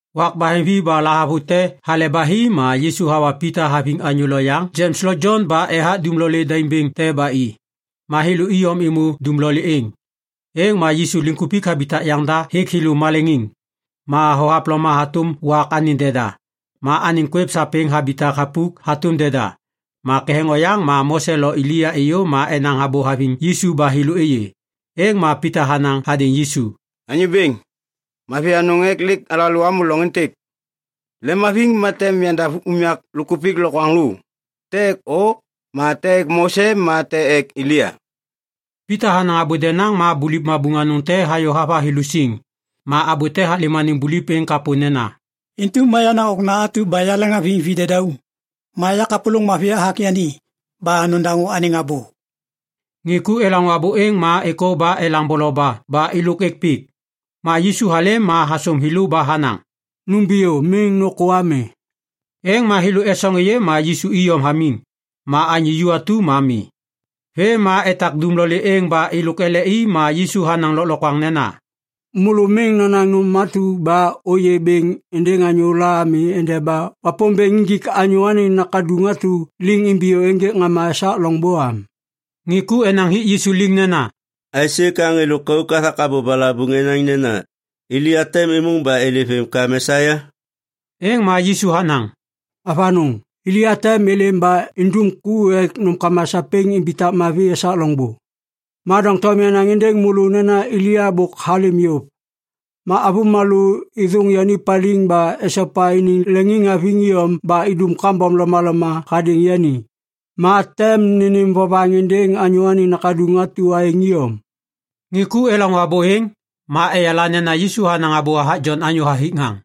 Wak baheŋvi ba lahavute hale ba hi ma Yisu hawa Pita haviŋ anyô loyaŋ Jems lo Jon ba ethak dumlolê daim bêŋ te ba i. Ma thêlô iyom êmô dumlolê êŋ. Êŋ ma Yisu liŋkupik habitak yaŋda hêk thêlô maleŋiŋ. Ma thohavloma hatôm wak anêŋ deda, ma anêŋ kwêv sapêŋ habitak thapuk hatôm deda. Ma ketheŋ oyaŋ ma Mose lo Elia êyô ma enaŋ abô haviŋ Yisu ba thêlô êyê. Êŋ ma Pita hanaŋ hadêŋ Yisu, “Anyô Bêŋ, mavi anôŋ ek lêk alalô amô loŋ êntêk. Lemhaviŋ ma tem yandav unyak lôkkupik lokwaŋlô, te ek o ma te ek Mose ma te ek Elia?” Pita hanaŋ abô denaŋ ma buliv mabuŋ anôŋ te hayô hava thêlô siŋ. Ma abô te halêm anêŋ buliv êŋ kapô nena, “Intu ma yenaŋ Okna atu ba yaleŋhaviŋ videdauŋ. Ma ya kapôlôŋ mavi hathak yani. Ba nodaŋô anêŋ abô!” Ŋê ku elaŋô abô êŋ ma êkô ba elaŋ boloba ba êlôk êk pik. Ma Yisu halêm ma hasôm thêlô ba hanaŋ, “Numbiyô, miŋ nôkô ami.” Êŋ ma thêlô esoŋ êyê ma Yisu iyom hamiŋ. Ma anyô ju atu ma mi. Vêm ma etak dumlolê êŋ ba êlôk ele i ma Yisu hanaŋ lôklokwaŋ nena, “Môlô miŋ nonaŋ nôm atu ba ôyê bêŋ êndêŋ anyôla ami endeba Wapômbêŋ injik Anyô Anêŋ Nakaduŋ atu liŋ imbiyô ênjêk ŋama esak loŋbô am.” Ŋê ku enaŋ hik Yisu liŋ nena, “Aisê ka ŋê lôkauk hathak abô balabuŋ enaŋ nena Elia tem êmôŋ ba êlêm vêm ka Mesia?” Êŋ ma Yisu hanaŋ, “Avanôŋ! Elia tem êlêm ba indum ku ek nômkama sapêŋ imbitak mavi esak loŋbô. Ma doŋtom yanaŋ êndêŋ môlô nena Elia bôk halêm yôv. Ma avômalô êthôŋ yani paliŋ ba esopa iniŋ leŋiŋhaviŋ iyom ba idum kambom lomaloma hadêŋ yani. Ma tem nênêm vovaŋ êndêŋ Anyô Anêŋ Nakaduŋ atu aêŋ iyom.” Ŋê ku elaŋô abô êŋ, ma eyala nena Yisu hanaŋ abô hathak Jon anyô hathik ŋaŋ.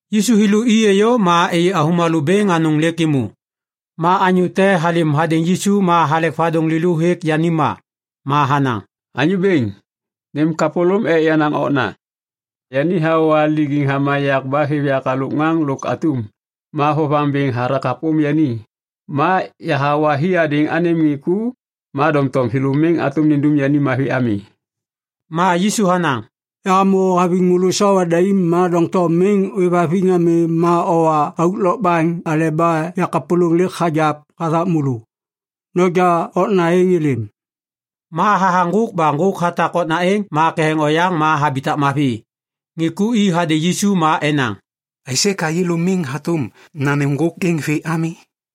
Yisu thêlô i êyô ma êyê avômalô bêŋ anôŋ lêk êmô. Ma anyô te halêm hadêŋ Yisu ma halek vadôŋ lêlô hêk yani ma, ma hanaŋ, “Anyô Bêŋ, nêm kapôlôm ek yenaŋ okna. Yani hawa lijiŋ hama yak ba hathak hêv yak halôk ŋaŋ lôk atum. Ma vovaŋ bêŋ hathak hapôm yani. Ma yahawa hi hadêŋ anêm ŋê ku, ma doŋtom thêlô miŋ hatôm nindum yani mavi ami.” Ma Yisu hanaŋ, “Yahamô haviŋ môlô sawa daim ma doŋtom miŋ ôêvhaviŋ ami ma owa auk lokbaŋ aleba yakapôlôŋ lêk hagiap hathak môlô. Noja okna êŋ êlêm!” Ma hathaŋ ŋgôk ba ŋgôk hatak okna êŋ ma ketheŋ oyaŋ ma habitak mavi. Ŋê ku i hadêŋ Yisu ma enaŋ, “Aisê ka yêlô miŋ hatôm nanêm ŋgôk êŋ vê ami?”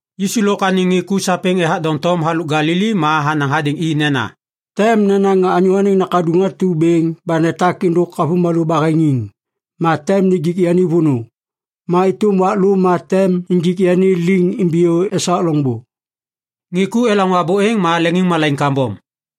Yisu lôk anêŋ ŋê ku sapêŋ ethak doŋtom halôk Galili ma hanaŋ hadêŋ i nena, “Tem nenaŋ Anyô Anêŋ Nakaduŋ atu bêŋ ba netak êndôk avômalô baheŋiŋ. Ma tem nijik yani vônô, ma êtôm wak lô ma tem injik yani liŋ imbiyô esak loŋbô.” Ŋê ku elaŋô abô êŋ ma leŋiŋmalaiŋ kambom.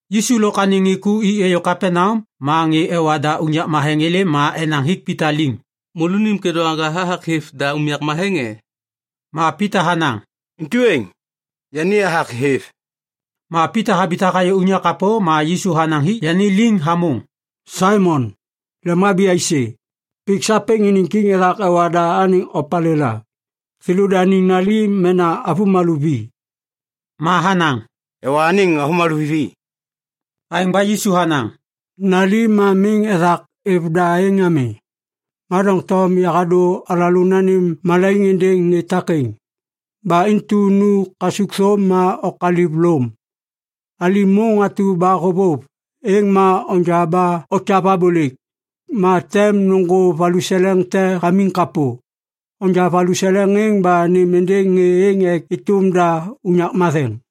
Yisu lôk anêŋ ŋê ku i êyô Kapaneam ma ŋê ewa da unyak matheŋ êlêm ma enaŋ hik Pita liŋ, “Môlônim kêdôŋwaga hathak hêv da unyak matheŋ e?” Ma Pita hanaŋ, “Intu êŋ. Yani hathak hêv.” Ma Pita habitak hayô unyak kapô ma Yisu hanaŋ hik yani liŋ hamôŋ, “Saimon, lemhabi aisê? Pik sapêŋ iniŋ kiŋ ethak ewa da anêŋ opalêla? Thêlôdaniŋ nali mena avômalô vi?” Ma hanaŋ, “Ewa anêŋ avômalô vi.” Aêŋ ba Yisu hanaŋ, “Nali ma miŋ ethak êv da êŋ ami. Ma doŋtom yahadô alalô nanêm malaiŋ êndêŋ ŋê takêŋ. Ba intu nu kasukthôm ma okaliv lôm. Alim môŋ atu ba hôvôv, êŋ ma onja ba okyav abôlêk. Ma tem nôŋgô valuseleŋ te hamiŋ kapô. Onja valuseleŋ êŋ ba nêm êndêŋ ŋê êŋ ek êtôm da unyak matheŋ.”